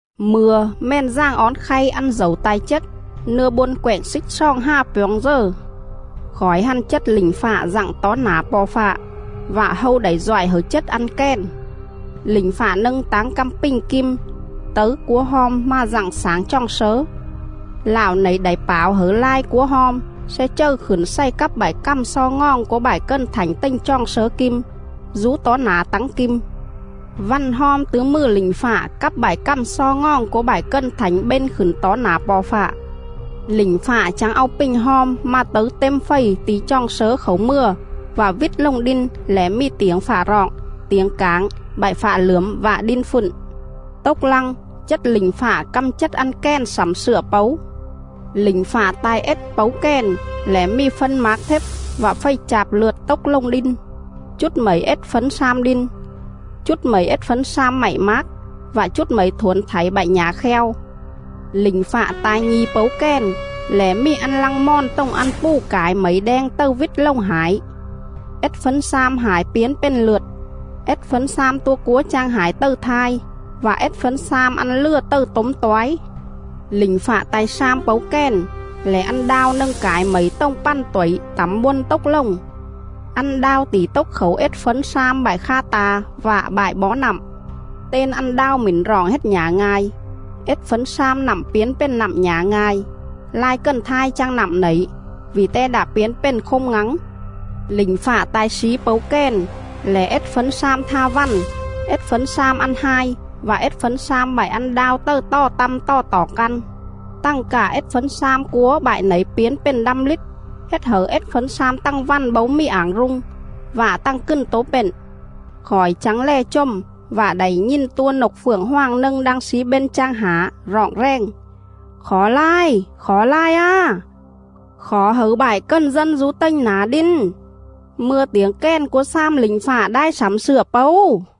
Mư̱a Mèn Dàng Ón khay ăn dẩu ta̱i chết, nưa bôn quẹng xích xoòng hà pjoo̱ng dờ. Khỏi hăn chết lỉnh fạ dặng tó nả Po̱ Fạ, vạ hâu đảy doại hẩư chết ăn kèn. Lỉnh fạ nâng táng căm pình kim tấư cúa hom mà dặng xảng choòng slớ. Lạo nẩy đảy pảo hẩư lai cúa hom sle chầư khửn xày cắp bại cằm xo ngoòng cúa bại cần thảnh tềnh choòng slớ kim dú tó nả tắng kim.. Vằn hom tứ mừ lỉnh fạ cắp bại cằm xo ngoòng cúa bại cần thảnh bên khửn tó nả Po̱ Fạ. Lỉnh fạ chắng au pình hom mà tấư têm fầy ti̱ choòng slớ khảu mừa vạ vít lồng đin lẻ mì tiểng fạ roọng, tiểng cảng, bại fạ lưởm vạ đin fựn.. Tốc lăng, chết lỉnh fạ căm chết ăn kèn slẳm slựa pấu. Lỉnh fạ ta̱i ết pấu kèn lẻ mì phân mác thếp vạ fầy chạp lượt tốc lồng đin. Chút mẩy ết fấn slam đin, chút mẩy ết fấn slam mạy mác, vạ chút mẩy thuổn thảy bại nhả kheo.. Lỉnh fạ ta̱i nhi̱ pấu kèn lẻ mì ăn lăng mòn tồng ăn pù cải mẩy đeng tầư vít lồng hải. Ết fấn slam hải piến pền lượt, ết fấn slam tua cúa chang hải tầư thai, vạ ết fấn slam ăn lừa tầư tốm toái. Lỉnh fạ ta̱i slam pấu kèn lẻ ăn đao nâng cải mẩy tồng pằn tuẩy tẳm bôn tốc lồng. Ăn đao tỉ tốc khảu ết fấn slam bại kha ta̱ vạ bại bó nặm.. Ten ăn đao mỉn roọng hết Nhả Nga̱i. Ết fấn slam nặm piến pền nặm nhả nga̱i; lai cần thai chang nặm nẩy, vỉ te đạ piến pền khôm ngắng.. Lỉnh fạ ta̱i slí pấu kèn lẻ ết fấn slam tha vằn, ết fấn slam ăn hai vạ ết fấn slam bại ăn đao tầư tò tăm tò toỏng căn, tằng cạ ết fấn slam cúa bại nẩy piến pền đăm lít, hết hẩư ết fấn slam tằng vằn bấu mì ảng rung, vạ tằng cừn tố pện.. Khỏi chắng lè chồm, vạ đảy nhìn tua nộc phượng hoàng nâng đang slí bên chang hả, roọng rèng: “Khỏ lai! Khỏ lai á! Khỏ hẩư bại cần dân dú tềnh nả đin, mư̱a tiểng kèn cúa slam lỉnh fạ đai slẳm slựa pấu.”